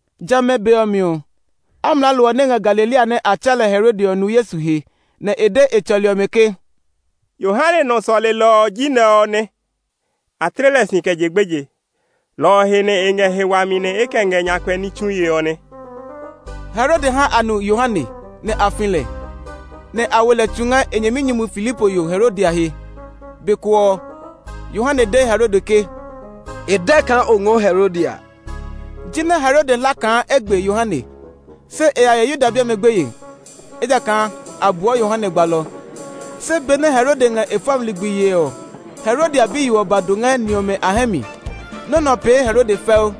Jamɛ a be ɔ mi ɔ, amlaalo ɔ nɛ ngɛ Galilea nɛ a tsɛɛ lɛ Herode ɔ nu Yesu he, nɛ e de e tsɔli ɔmɛ ke, “Yohane nɔ sɔlelɔ ɔ ji nɛ ɔ nɛ. A tle lɛ si kɛ je gbeje; lɔ ɔ he nɛ e ngɛ he wami nɛ e kɛ ngɛ nyakpɛ ní tsue ɔ nɛ.” Herode ha a nu Yohane, nɛ a fi lɛ, nɛ a wo lɛ tsu ngɛ e nyɛminyumu Filipo yo Herodia he. Be ko ɔ, Yohane de Herode ke, “E dɛ kaa o ngɔɔ Herodia!” Jinɛ Herode hla kaa e gbe Yohane, se e ya ye Yuda bi ɔmɛ gbeye; ejakaa a buɔ Yohane gbalɔ. Se benɛ Herode ngɛ e fɔmi ligbi yee ɔ, Herodia biyo ɔ ba do ngɛ ni ɔmɛ a hɛ mi. Nɔ́ nɛ ɔ pee Herode fɛu,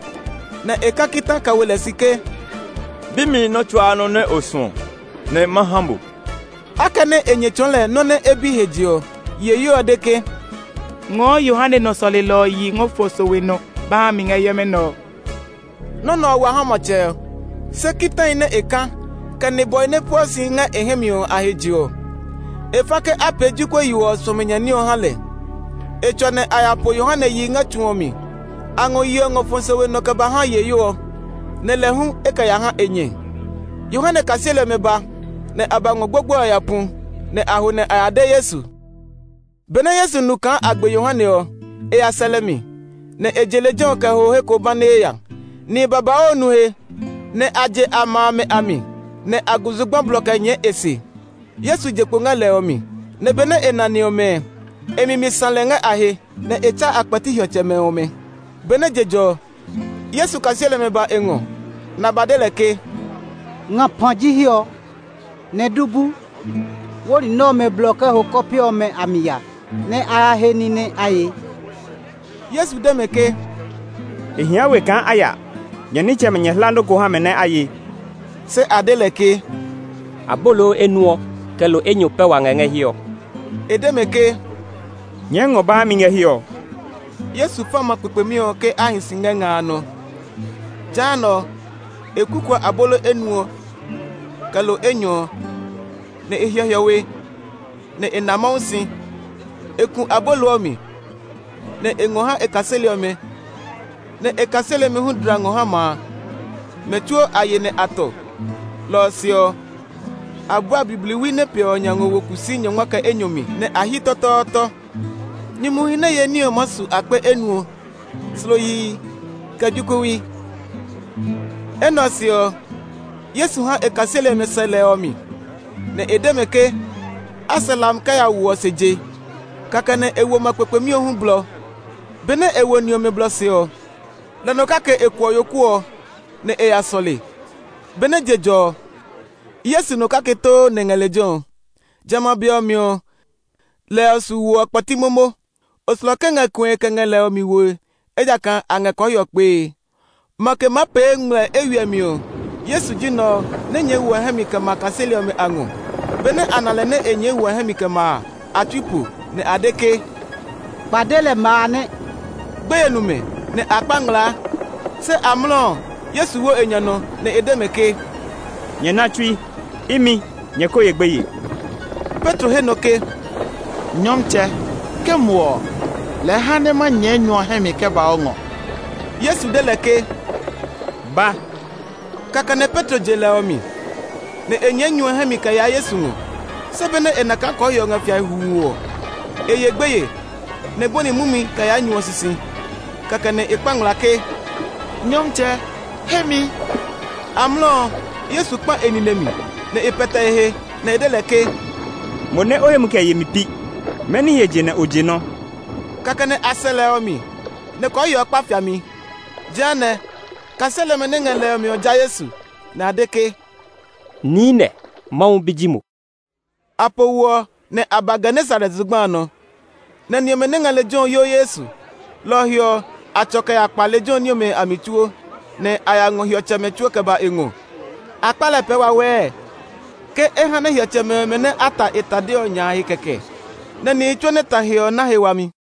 nɛ e ka kita kɛ wo lɛ si ke, “Bi mi nɔ́ tsuaa nɔ́ nɛ o suɔ, nɛ ma ha mo!” Akɛnɛ e nyɛ tsɔɔ lɛ nɔ́ nɛ e bi he je ɔ, yiheyo ɔ de ke, “Ngɔɔ Yohane nɔ sɔlelɔ ɔ yi ngɔ fɔ sowe nɔ ba ha mi ngɛ hiɛmɛ nɛ ɔ!” Nɔ́ nɛ ɔ wa ha matsɛ ɔ, se kitahi nɛ e ka, kɛ nibwɔhi nɛ pueɔ si ngɛ e hɛ mi ɔ a he je ɔ, e fa ke a pee jokuɛ yo ɔ suɔmi nya ní ɔ ha lɛ. E tsɔ nɛ a ya po Yohane yi ngɛ tsu ɔ mi. A ngɔ yi ɔ ngɔ fɔ sowe nɔ kɛ ba ha yiheyo ɔ, nɛ lɛ hu e kɛ ya ha e nyɛ. Yohane kaseli ɔmɛ ba, nɛ a ba ngɔ gbogboe ɔ ya pu. Nɛ a ho nɛ a ya de Yesu. Benɛ Yesu nu kaa a gbe Yohane ɔ, e ya sɛ lɛ mi, nɛ e je lejɛ ɔ kɛ ho he ko banee ya. Nihi babauu nu he, nɛ a je a ma amɛ a mi, nɛ a gu zugba blɔ kɛ nyɛɛ e se. Yesu je kpo ngɛ lɛ ɔ mi, nɛ benɛ e na ni ɔmɛ ɔ, e mi mi sã lɛ ngɛ a he, nɛ e tsa a kpɛti hiɔtsɛmɛ ɔmɛ. Benɛ je jɔ ɔ, Yesu kaseli ɔmɛ ba e ngɔ, nɛ a ba de lɛ ke, “ngapa ji hiɛ ɔ, nɛ du bu. Wó ni ɔmɛ blɔ kɛ ho kɔpe ɔmɛ a mi ya, nɛ a ya he ní nɛ a ye.” Yesu de mɛ ke, “E hia we kaa a ya; nyɛ nitsɛmɛ nyɛ hla nɔ́ ko ha mɛ nɛ a ye.” Se a de lɛ ke, “Abolo enuɔ, kɛ lo enyɔ pɛ wa ngɛ ngɛ hiɛ ɔ.” E de mɛ ke, “Nyɛɛ ngɔ ba ha mi ngɛ hiɛ ɔ!” Yesu fa ma kpekpemi ɔ ke a hi si ngɛ nga a nɔ. Jehanɛ, e kukuɔ abolo enuɔ ɔ, kɛ lo enyɔ ɔ, nɛ e hyɛ hiɔwe nɛ e na Mawu si. E ku abolo ɔ mi, nɛ e ngɔ ha e kaseli ɔmɛ, nɛ e kaseli ɔmɛ hu dla ngɔ ha ma a. Mɛ tsuo a ye nɛ a tɔ. Lɔ ɔ se ɔ, a bua bibliwi nɛ piɛ ɔ nya ngɔ wo kusii nyɔngma kɛ enyɔ mi, nɛ a hyi tɔtɔɔtɔ. Nyumuhi nɛ ye ní ɔ maa su akpe enuɔ, slo yihi, kɛ jokuɛwi. Enɛ ɔ se ɔ, Yesu ha e kaseli ɔmɛ sɛ lɛ ɔ mi, nɛ e de mɛ ke a sɛ hlami kɛ ya wo ɔ se je. Kɛkɛ nɛ e wo ma kpekpemi ɔ hu blɔ. Benɛ e wo ni ɔmɛ blɔ se ɔ, lɛ nɔ kake e kuɔ yoku ɔ, nɛ e ya sɔle. Benɛ je jɔ ɔ, Yesu nɔ kake too nɛ ngɛ lejɛ ɔ. Jamɛ a be ɔ mi ɔ, lɛ ɔ su wo ɔ kpɛti momo. Oslɔke ngɛ kue kɛ ngɛ lɛ ɔ mi woe, ejakaa a ngɛ kɔɔhiɔ kpee. Makɛ maa pee ngmlɛ eywiɛ mi ɔ, Yesu ji nɛ ɔ nɛ nyɛɛ wo ɔ hɛ mi kɛ ma kaseli ɔmɛ a ngɔ. Benɛ a na lɛ nɛ e nyɛɛ wo ɔ hɛ mi kɛ ma a, a tsui po, nɛ a de ke, “Kpade lɛ ma a nɛ!” Gbeye nu mɛ, nɛ a kpa ngmlaa. Se amlɔ ɔ, Yesu wo e nya nɔ, nɛ e de mɛ ke, “Nyɛ na tsui, imi! Nyɛ ko ye gbeye!” Petro he nɔ ke, “Nyɔmtsɛ, ke mo ɔ, lɛɛ ha nɛ ma nyɛɛ nyu ɔ hɛ mi kɛ ba o ngɔ.” Yesu de lɛ ke, “Ba!” Kɛkɛ nɛ Petro je lɛ ɔ mi, nɛ e nyɛɛ nyu ɔ hɛ mi kɛ yaa Yesu ngɔ. Se benɛ e na kaa kɔɔhiɔ ɔ ngɛ fiae huu ɔ, e ye gbeye, nɛ e bɔni mumi kɛ yaa nyu ɔ sisi. Kɛkɛ nɛ e kpa ngmlaa ke, “Nyɔmtsɛ, he mi!” Amlɔ ɔ, Yesu kpã e nine mi, nɛ e pɛtɛ e he, nɛ e de lɛ ke, “Mo nɛ o hemi kɛ yemi pi! Mɛni he je nɛ o je nɔ́?” Kɛkɛ nɛ a sɛ lɛ ɔ mi, nɛ kɔɔhiɔ ɔ kpa fiami. Jehanɛ, kaseli ɔmɛ nɛ ngɛ lɛ ɔ mi ɔ ja Yesu, nɛ a de ke, “Niinɛ, Mawu Bi ji mo!” A po wo ɔ, nɛ a ba Genesaret zugba a nɔ, nɛ ni ɔmɛ nɛ ngɛ lejɛ ɔ yo Yesu. Lɔ ɔ he ɔ, a tsɔ kɛ ya kpa lejɛ ɔ ní ɔmɛ a mi tsuo, nɛ a ya ngɔ hiɔtsɛmɛ tsuo kɛ ba e ngɔ. A kpa lɛ pɛɛ wawɛɛ ke e ha nɛ hiɔtsɛmɛ ɔmɛ nɛ a ta e tade ɔ nya a he kɛkɛ. Nɛ nihi tsuo nɛ ta he ɔ na he wami.